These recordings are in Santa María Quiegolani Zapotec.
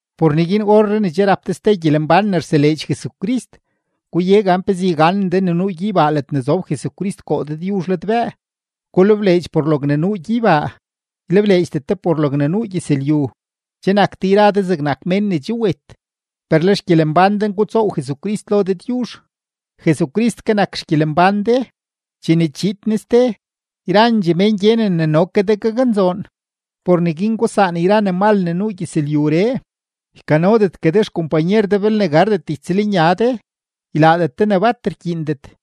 Por neguin orree ne che rap de ste gyelembán ne rseleedx Jesucrist, guye gan pezee yganen de ne nuu gyeybaa ledne zob Jesucrist koo Dëdyuzh ladbëë. Gulebleedx por logne nuu gyeybaa, ylebleedxdet de por logne nuu gyëzlyu. Che nak de yra de zegnak mén ne che wet, per le xgyelembán de ngutsoow Jesucrist lo Dëdyuzh. Jesucrist ke nak xgyelembán de; chene chiid Ne ste, yrandxee mén gyenen ne no ke de gaknzoon. Por neguin gusaan yra ne mal ne nuu gyëzlyuree: ykanodetgue de xkompanyer de belne gardet ytsëlnya de, ylaadet de ne bat rkyiindet,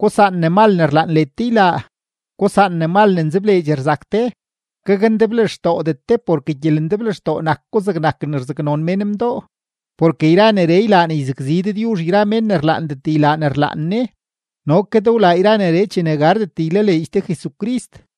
gusaan ne mal ne rlaan led de ylaa, gusaan ne mal ne nzebleedx rzak de, gakndeblextoodet de porke gyelendeblextoo nak ko zegnak ne rzaknon mén mdoo. Porke yra neree ylaa ne yzakzi Dëdyuzh yra mén ne rlaandet ylaa ne rlaan Ne. No ke de wlaa yra neree chene gardet ylaleedx de Jesucrist.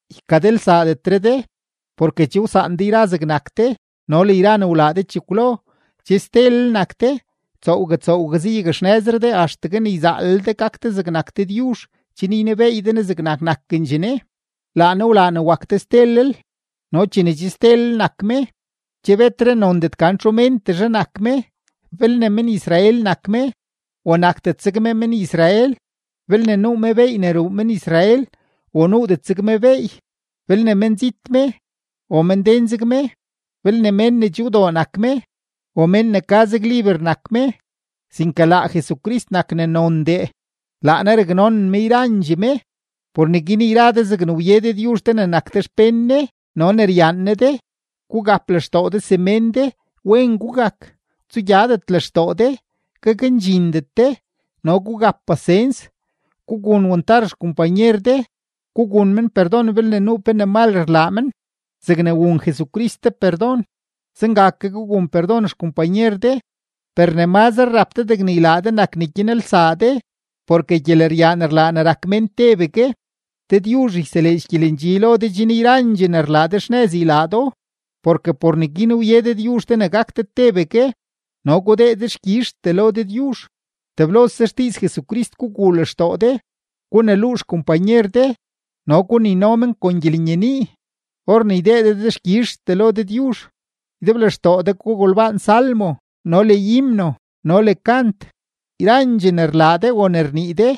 Ykadelsaadetre de, porke che wsaan de yra zegnak de no le yra ne wlaa de chekwlo. Che stelel nak de, tsoowgue tsoowgue zayakxnëzre de axtegue ne yzaalel de gak de zegnak Dëdyuzh chen ynebeey de Ne zegnak nakendxee Ne; laa Ne wlaa ne wak de stelel. No chene che stelel nak me, che betre nondet ne gan txu méntezhe nak me, belne men-Israel me o nakdet zeg me men-Israel, belne nuu me beey ne ruu men-Israel o nuudet zeg me beey, belne menzit me o menden zeg me, belne mén ne che wdoo nak me o mén ne ka zeg liber nak me, sinke laa Jesucrist nak ne nondee, laa Ne raknonen me yrandxee me. Por neguin yra de zegne wye Dëdyuzh de ne nak de xpén Ne no ne ryaan Ne de, gugap lextoo de semén de, wen gugak, tsugyadet lextoo de, gakndxindet de, no gugap pasens. Gugun wantar xkompanyer de, gugun men perdon belne nuu pe ne mal rlaa men. Zegne wun Jesucrist de perdon, zenga ke gugun perdon xkompanyer de. Per ne mazre rap de degne ylaa de nak ne gyanelsaa de, porke gyeleryaan rlaa ne rak mén tebegue. Dëdyuzh yseleedx gyelendxi lo de chen yrandxee ne rlaa de xnëz ylaa do, porke por neguin wye Dëdyuzh de ne gak de tebegue, no gudee dexkyizhtee lo Dëdyuzh. Teblose xdiiz Jesucrist guguu lextoo de; guneluu xkompanyer de no gunino men kon gyelenyenii; or ne ydee de dexkyizhtee lo Dëdyuzh, ydeblextoo de gugolbaan salmo no le himno no le kant. Yrandxee ne rlaa de o ne rnii de,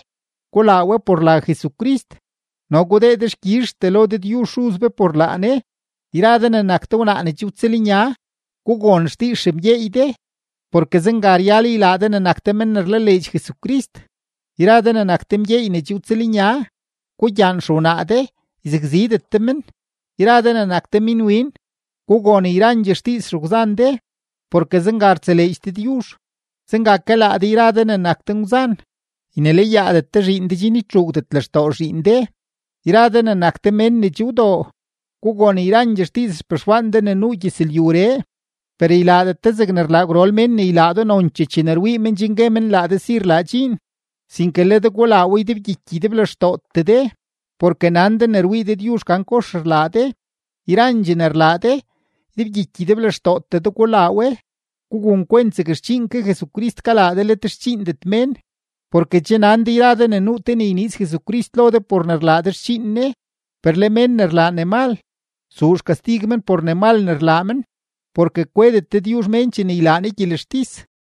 gulaa we por la Jesucrist no gudee dexkyizhtee lo Dëdyuzh Xuz be por laa Ne. Yra de ne nak de wnaa ne che wtsëlnya, gugon xdiiz xemgyeey de, porke zenga ryal ylaa de ne nak de men ne rlaleedx Jesucrist. Yra de ne nak de mgyeey ne che wtsëlnya, gugyaan xewnaa de, yzakzidet de men. Yra de ne nak de minwin, gugon yrandxee xdiiz xegwzan de, porke zenga rtseleedx Dëdyuzh. Zenga ke laa de yra de ne nak de ngwzan, ynelayaadet de zhiin de chen ytxuugdet lextoo zhiin de. Yra de ne nak de mén ne che wdoo, gugon yrandxee xdiiz xpexwaan de ne nuu gyëzlyuree, per ylaadet de zegne rlaa gwrol mén ne ylaa do nonchee chene rwii men chen gue men laa de si rlaa dxiin, sinke le de gulaa we ydebgyiky ydeblextootee de, porke nan de ne rwii Dëdyuzh gan kox rlaa de. Yrandxee ne rlaa de, ydebgyiky ydeblextootee de gulaa we; gugun kwent zeg xdxiin ke Jesucrist kalaa de let xdxiindet mén. Porke che nan de yra de ne nuu te ne yniiz Jesucrist lo de por ne rlaa de xdxiin Ne. Per le mén ne rlaa ne mal, zuu xkastig men por ne mal ne rlaa men, porke kwedet Dëdyuzh mén chene ylaa Ne gyelextis.